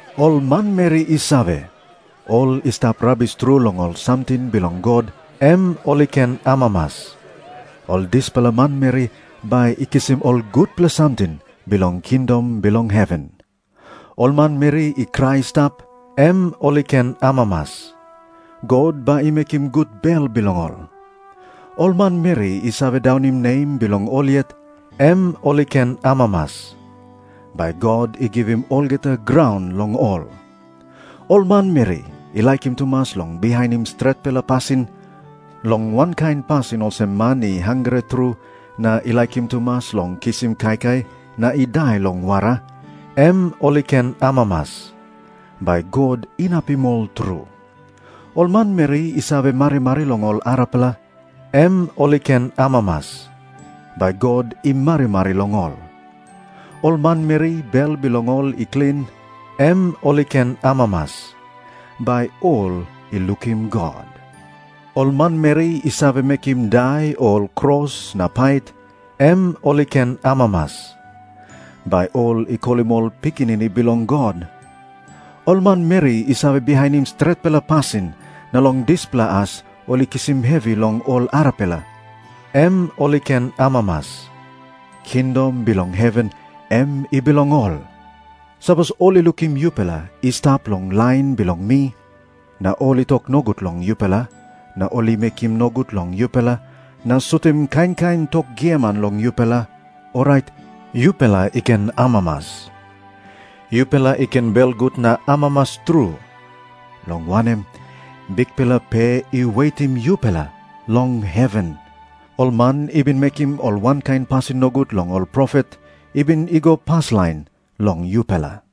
"Ol manmeri i save, ol i stap rabis tru long ol samting bilong God, em ol i ken amamas. Ol dispela manmeri bai i kisim ol gutpela samting bilong kingdom bilong heven. "Ol manmeri i krai i stap, em ol i ken amamas. God bai i mekim gut bel bilong ol. "Ol manmeri i save daunim nem bilong ol yet, em ol i ken amamas. Bai God i givim olgeta graun long ol. "Ol manmeri i laikim tumas long bihainim stretpela pasin, long wankain pasin olsem man i hangre tru na i laikim tumas long kisim kaikai na i dai long wara, em ol i ken amamas. Bai God inapim ol tru. "Ol manmeri i save marimari long ol arapela, em ol i ken amamas. Bai God i marimari long ol. "Ol manmeri bel bilong ol i klin, em ol i ken amamas. Bai ol i lukim God. "Ol manmeri i save mekim dai ol kros na pait, em ol i ken amamas. Bai ol i kolim ol pikinini bilong God. "Ol manmeri i save bihainim stretpela pasin na long dispela as ol i kisim hevi long ol arapela, em ol i ken amamas. Kingdom bilong heven em i bilong ol. "Sapos ol i lukim yupela i stap long lain bilong mi, na ol i tok nogut long yupela na ol i mekim nogut long yupela na sutim kain kain tok giaman long yupela, orait yupela i ken amamas. Yupela i ken belgut na amamas tru, long wanem, bikpela pe i wetim yupela long heven. Ol man i bin mekim ol wankain pasin nogut long ol profet i bin i go paslain long yupela."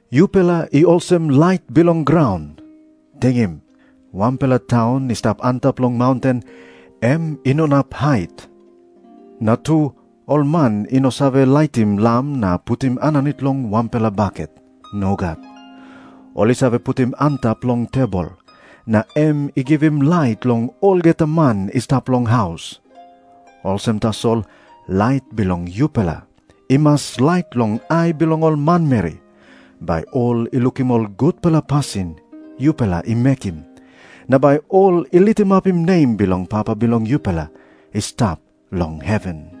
"Yupela i olsem lait bilong graun. Tingim. Wanpela taun i stap antap long maunten, em i no inap hait. Na tu, ol man i no save laitim lam na putim aninit long wanpela baket. Nogat. Ol i save putim antap long tebol, na em i givim lait long olgeta man i stap long haus. Olsem tasol, lait bilong yupela i mas lait long ai bilong ol manmeri, bai ol i lukim ol gutpela pasin yupela i mekim, na bai ol i litimapim nem bilong Papa bilong yupela i stap long heven."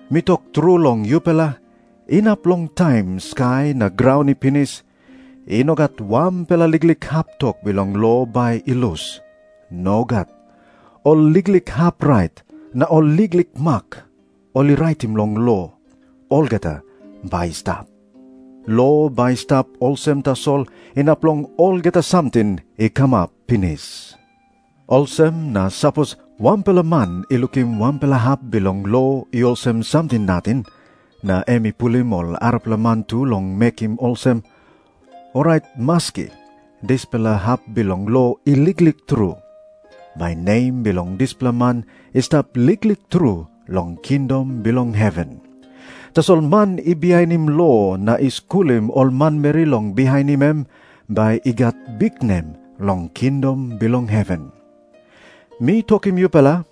Mi tok tru long yupela, inap long taim skai na graun i pinis, i no gat wanpela liklik hap tok bilong lo bai i lus. Nogat. Ol liklik hap rait, na ol liklik mak ol i raitim long lo, olgeta bai i stap. Lo bai i stap olsem tasol inap long olgeta samting i kamap pinis. Olsem na sapos wanpela man i lukim wanpela hap bilong lo i olsem samting nating, na em i pulim ol arapela man tu long mekim olsem, orait maski dispela hap bilong lo i liklik tru, bai nem bilong dispela man i stap liklik tru long kingdom bilong heven. Tasol man i bihainim lo na i skulim ol manmeri long bihainim, em bai i gat biknem long kingdom bilong heven. Mi tokim yupela,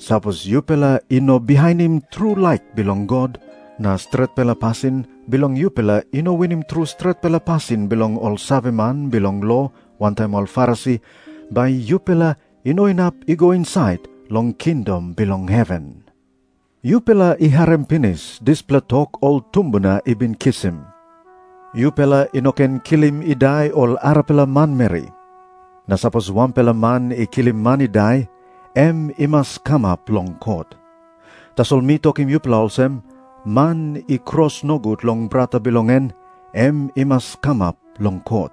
sapos yupela i no bihainim tru laik bilong God, na stretpela pasin bilong yupela i no winim tru stretpela pasin bilong ol saveman bilong lo wantaim ol Farisi, bai yupela i no inap i go insait long kingdom bilong heven." Jisas i tok moa olsem, "Yupela i harim pinis dispela tok ol tumbuna i bin kisim, 'Yupela i no ken kilim i dai ol arapela manmeri. Na sapos wanpela man i kilim man i dai, em i mas kamap long kot.' Tasol mi tokim yupela olsem, man i kros nogut long brata bilong en, em i mas kamap long kot.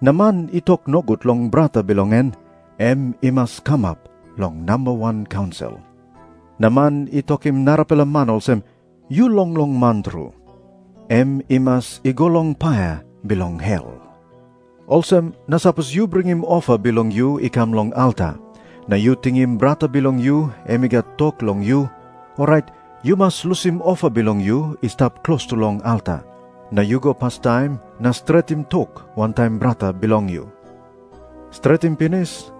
Na man i tok nogut long brata bilong en, em i mas kamap long namba wan kaunsil. Na man i tokim narapela man olsem, 'Yu longlong man tru,' em i mas i go long paia bilong hel. "Olsem na sapos yu bringim ofa bilong yu i kam long alta, na yu tingim brata bilong yu em i gat tok long yu, orait yu mas lusim ofa bilong yu i stap klostu long alta. Na yu go pastaim na stretim tok wantaim brata bilong yu. Stretim pinis,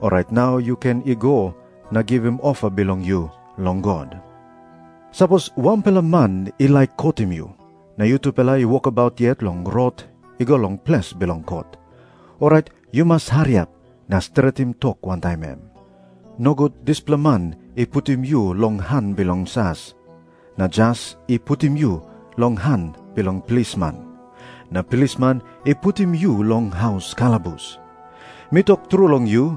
orait nau yu ken i go na givim ofa bilong yu long God. "Sapos wanpela man i laik kotim yu, na yutupela i wokabaut yet long rot i go long ples bilong kot, orait yu mas hariap na stretim tok wantaim em. Nogut dispela man i putim yu long han bilong jas, na jas i putim yu long han bilong plisman, na plisman i putim yu long haus kalabus. Mi tok tru long yu,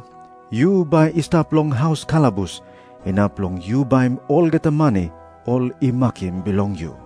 yu bai i stap long haus kalabus inap long yu baim olgeta mani ol i makim bilong yu."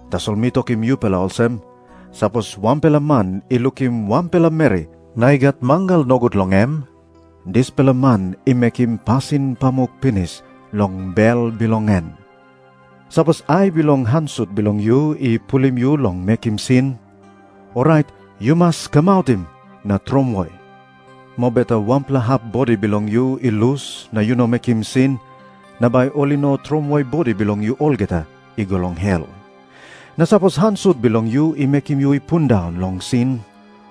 Tasol mi tokim yupela olsem, sapos wanpela man i lukim wanpela meri na i gat mangal nogut long em, dispela man i mekim pasin pamuk pinis long bel bilong em. "Sapos ai long han sut bilong yu i pulim yu long mekim sin, orait yu mas kamautim na tromoi. Mobeta wanpela hap bodi bilong yu i lus na yu no mekim sin, na bai ol i no tromoi bodi bilong yu olgeta i go long hel. Na sapos han sut bilong yu i mekim yu i pundaun long sin,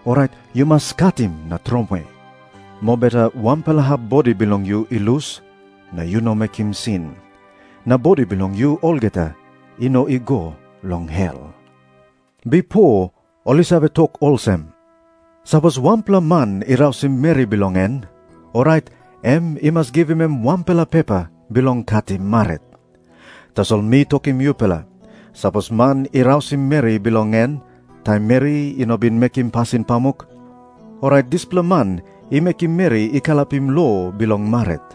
orait yu mas katim na tromoi. Mobeta wanpela hap bodi bilong yu i lus, na yu no mekim sin, na bodi bilong yu olgeta i no i go long hel." Jisas i tok moa olsem, "Bipo ol i save tok olsem, 'Sapos wanpela man i rausim meri bilong en, orait em i mas givim em wanpela pepa bilong katim marit.' Tasol mi tokim yupela, sapos man i rausim meri bilong en taim meri i no bin mekim pasin pamuk, orait dispela man i mekim meri i kalapim lo bilong marit.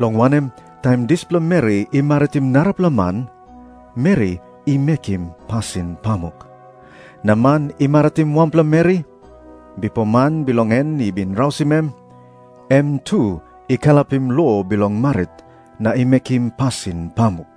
Long wanem, taim dispela meri i maritim narapela man, meri i mekim pasin pamuk. Na man i maritim wanpela meri, bipo man bilong en i bin rausim em, em tu i kalapim lo bilong marit na i mekim pasin pamuk."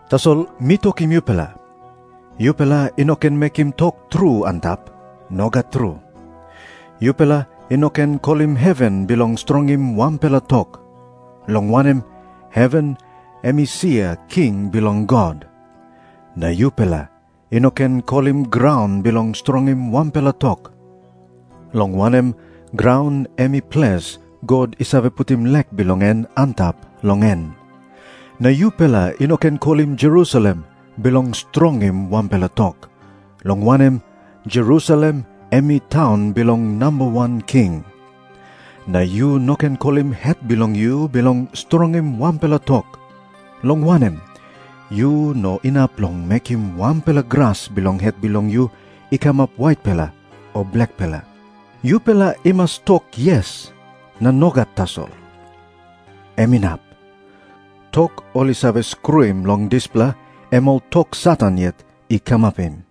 Tasol mi tokim yupela, yupela i no ken mekim tok tru antap. Nogat tru. Yupela i no ken kolim heven bilong strongim wanpela tok, long wanem, heven em i sia king bilong God. Na yupela i no ken kolim graun bilong strongim wanpela tok, long wanem, graun em i ples God i save putim lek bilong en antap long en. Na yupela i no ken kolim Jerusalem bilong strongim wanpela tok, long wanem, Jerusalem em i taun bilong Nambawan King. Na yu no ken kolim het bilong yu bilong strongim wanpela tok, long wanem, yu no inap long mekim wanpela gras bilong het bilong yu i kamap waitpela o blakpela. Yupela i mas tok 'Yes' na 'Nogat' tasol. Em inap. Tok ol i save skruim long dispela, em ol tok Satan yet i kamapim."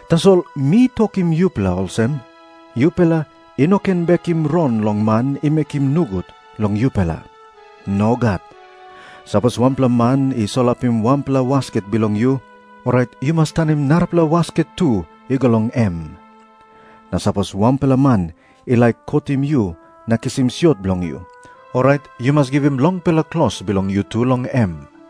Tasol mi tokim yupela olsem, yupela i no ken bekim rong long man i mekim nogut long yupela. Nogat. Sapos wanpela man i solapim wanpela wasket bilong yu, orait yu mas tanim narapela wasket tu i go long em. Na sapos wanpela man i laik kotim yu na kisim siot bilong yu, orait yu mas givim longpela klos bilong yu tu long em.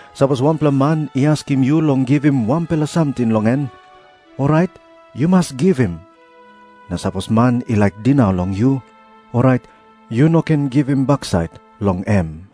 Sapos wanpela man i askim yu long givim wanpela samting long em, orait yu mas givim. Na sapos man i laik dinau long yu, orait yu no ken givim baksait long em."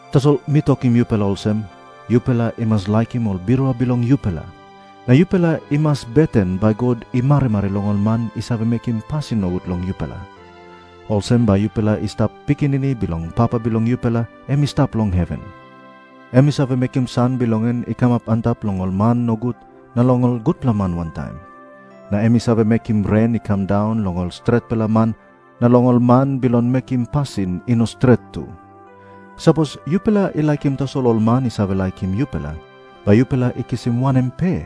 Tasol mi tokim yupela olsem, yupela i mas laikim ol birua bilong yupela, na yupela i mas beten bai God i marimari long ol man i save mekim pasin nogut long yupela. Olsem bai yupela i stap pikinini bilong Papa bilong yupela em i stap long heven. Em i save mekim san bilong en i kamap antap long ol man nogut na long ol gutpela man wantaim. Na em i save mekim ren i kam daun long ol stretpela man na long ol man bilong mekim pasin i no stret tu. Sapos yupela i laikim tasol ol man i save laikim yupela, bai yupela i kisim wanem pe?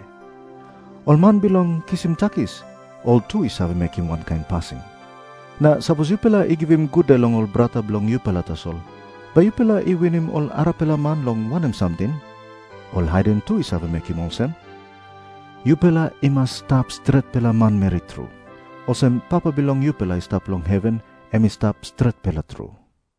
Ol man bilong kisim takis, ol tu i save mekim wankain pasin. Na sapos yupela i givim gude long ol brata bilong yupela tasol, bai yupela i winim ol arapela man long wanem samting? Ol haiden tu i save mekim olsem. Yupela i mas i stap stretpela manmeri tru, olsem Papa bilong yupela i stap long heven em i stap stretpela tru."